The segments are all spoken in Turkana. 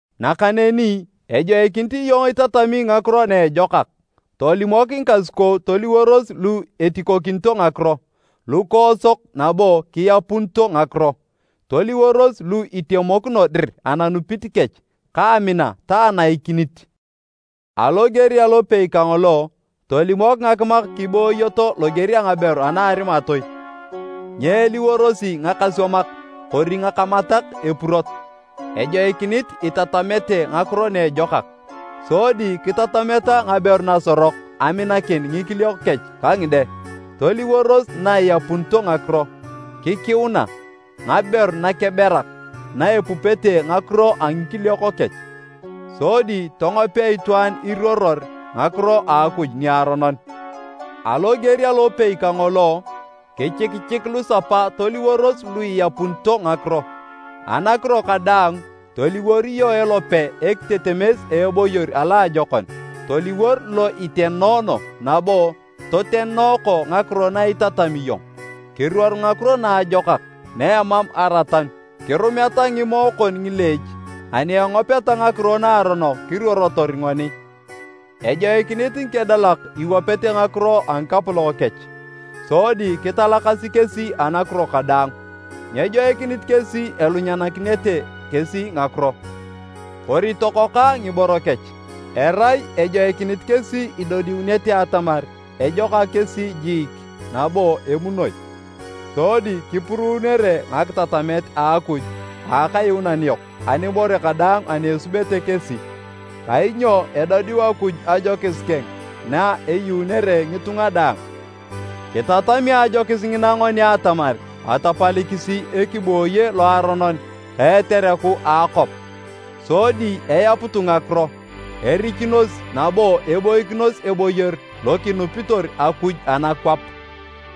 Nakaneni ejoikinit iyong itatami ngakiro na ejokak. Tolimok ngikasukou toliworos lu etikokinito ngakiro, lukoosok nabo kiapunito ngakiro. Toliworos lu itemokino dir ananupit kech, ka amina ta anaikinit. Aloger alopei kangolo, tolimok ngakimak kibooyoto loger a ngaberu ana arimatoi. Nyeeliworosi ngakaswamak kori ngakamatak epurot. Ejoikinit itatamete ngakiro na ejokak, sodi kitatameta ngaberu nasorok aminakin ngikiliok kech ka ngide, toliworos na iapunito ngakiro, kikiuna, ngaberu nakeberak na epupete ngakiro a ngikiliok kech, sodi tongopea itwaan iruoror ngakiro a Akuj niaronon. Aloger alopei kangolo, kichikichik lusapa toliworos lu iapunito ngakiro. Anakiro kadaang, toliwor iyong elope ekitetemes a eboyor a loajokon. Toliwor lo itenoono nabo totenooko ngakiro na itatami iyong. Kiruor ngakiro naajokak na emam aratanu, kirumeta ngimoe kon ngileech ani engopeta ngakiro naaronok kiruorotor ngoni. Ejoikinit ngikedalak iwapete ngakiro a ngikapolok kech sodi kitalakasi kesi anakiro kadaang. Nyejoikinit kesi elunyanakinete kesi ngakiro kori tokokoa ngiboro kech. Erai ejoikinit kesi idodiunete atamar ejokak kesi jiik nabo emunoi, sodi kipuruunere ngakitatamet a Akuj a Akayuunan yok anibore kadaang ani esubete kesi. Kainyo edodiu Akuj ajokis keng na eyuunere ngitunga daang. Kitatami ajokis ngina ngoni atamar atapalikisi ekibooye loaronon ka etereku a akwap, sodi eyaputu ngakiro, erichunos nabo eboikinos eboyor lo kinupitor Akuj anakwap,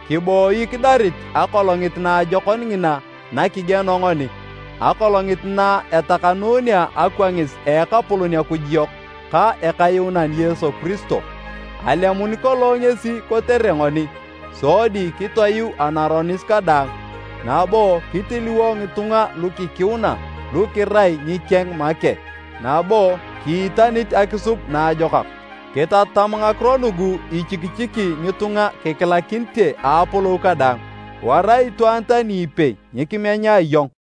kiboi kidarit akolongit naajokon ngina nakigieno ngoni, akolongit na etakanunea akwangis a Ekapolon Akuj yok ka Ekayuunan Yesu Kiristo. Alemun kolong ngesi kotere ngoni sodi kitoyuu anaronis kadaang, nabo kitiliwo ngitunga lukikiuna lu kirai ngikeng make, nabo kiitanit akisub naajokak. Kitatam ngakiro nugu ichikichiki ngitunga kikilakinite a apolou kadaang. Wara itwaan tani ipei nyikimenya iyong.